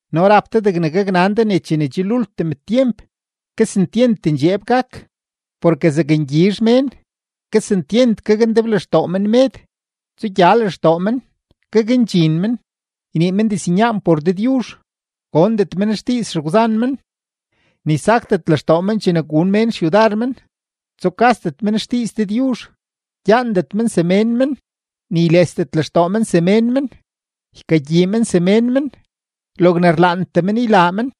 No rap de degne gaknan de ne chene che lultim tyemp, kesentyent ndxeeb gak. Porke zakngyizh mén, kesentyent gakndeblextoo men med, tsugya lextoo men, gakndxin men, ynii men diznyaan por Dëdyuzh, gondet men xdiiz xegwzan men, ni sakdet lextoo men chene gun mén xyudar men, tsukasdet men xdiiz Dëdyuzh, gyaandet men semén men, ni ylesdet lextoo men semén men, ykagyii men semén men, logne rlaantee men ylaa men,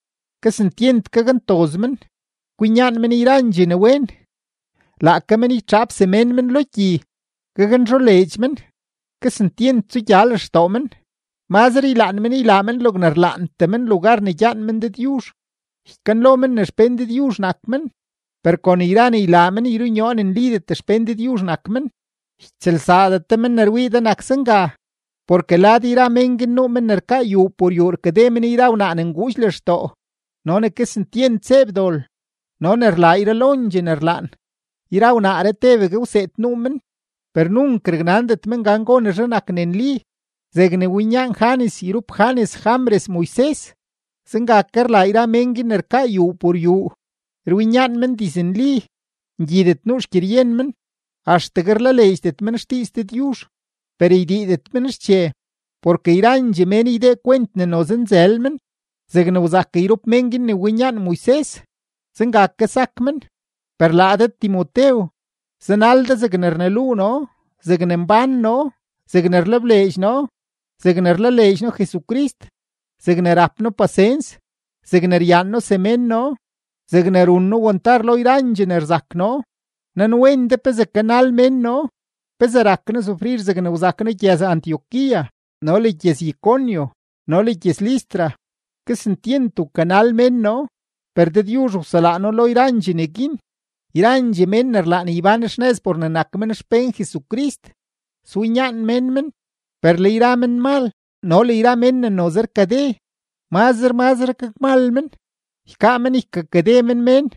kesentyent gakntoz men, kwinyaan men yrandxee ne wen, laake men ytxaap semén men lo gyi, gaknzholeedx men, kesentyent tsugya lextoo men, mazre ylaan men ylaa men logne rlaantee men lugar ne gyaan men Dëdyuzh. Ykanlo men ne xpén Dëdyuzh nak men, per kon yra ne ylaa men yrunyoo ne nlidet xpén Dëdyuzh nak men. Ytsëlsaadet de men ne rwii de nak zenga. Porke lad yra mén guin nuu men ne rkaa yuu por yuu rkakade men yra wnaa ne nguudx lextoo, no ne kesentyent zeeb dol, no ne rlaa yralondxee ne rlaan. Yra wnaaree tebegue gwseed nuu men, per nunk raknandet men gan gonezhe nak ne nli. Zegne winyaan Janes yrup Janes Jambres Moises, zenga ke rlaa yra mén guin ne rkaa yuu por yuu; rwinyaan men diznli, ngyidet nuu xgyeryen men, axtegue rlaleedxdet men xdiiz Dëdyuzh. Per ydiidet men xche, porke yrandxee mén ydee kwent ne noze nzël men; zegne wzak yrup mén guin ne winyaan Moises, zenga ke sak men. Per laa de Timotew, zanal de zegne rneluu noo, zegne mbán noo, zegne rlebleedx noo, zegne rlaleedx noo Jesucrist, zegne rap noo pasens, zegne ryaan noo semén noo, zegne run noo wantar lo yrandxee ne rzak noo; nanwen de pezee kanal mén noo, pezee rak noo sufrir zegne wzak noo gyëz-Antioquía no le gyëz-Iconio no le gyëz-Listra, kesentyent wkanal mén noo, per Dëdyuzh wselaa noo lo yrandxee neguin. Yrandxee mén ne rlaan ybán xnëz por ne nak men xpén Jesucrist, swinyaan mén men. Per le yra menmal no le yra mén ne noze rkade, mazre mazre gakmal men, ykaa men ykakade men mén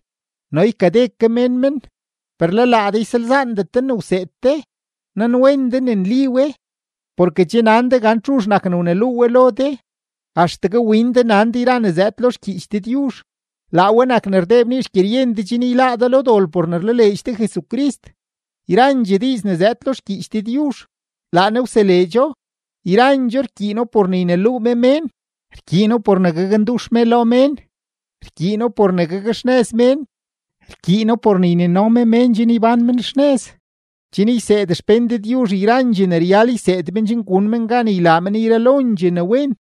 no ykade ke mén men. Per le laa de ysalzaandet de ne wseed de, nanwen de ne nli we, porke che nan de gan txuzh nak ne wneluu we lo de. Axtegue win de nan de yra ne zëëd lo xgyiich Dëdyuzh; laa we nak ne rdee bnii xgyeryen de chen yláá de lo dol por ne rlaleedx de Jesucrist. Yrandxee diiz ne zëëd lo xgyiich Dëdyuzh, laa Ne wseleedxo, yrandxoo rkyiino por ne yneluu me mén, rkyiino por ne gakndux me lo mén, rkyiino por ne gakxnëz mén, rkyiino por ne ynino me mén chen ybán men xnëz, chen yseed xpén Dëdyuzh yrandxee ne ryal yseed men chen gun men gan ylaa men yralondxee ne wen.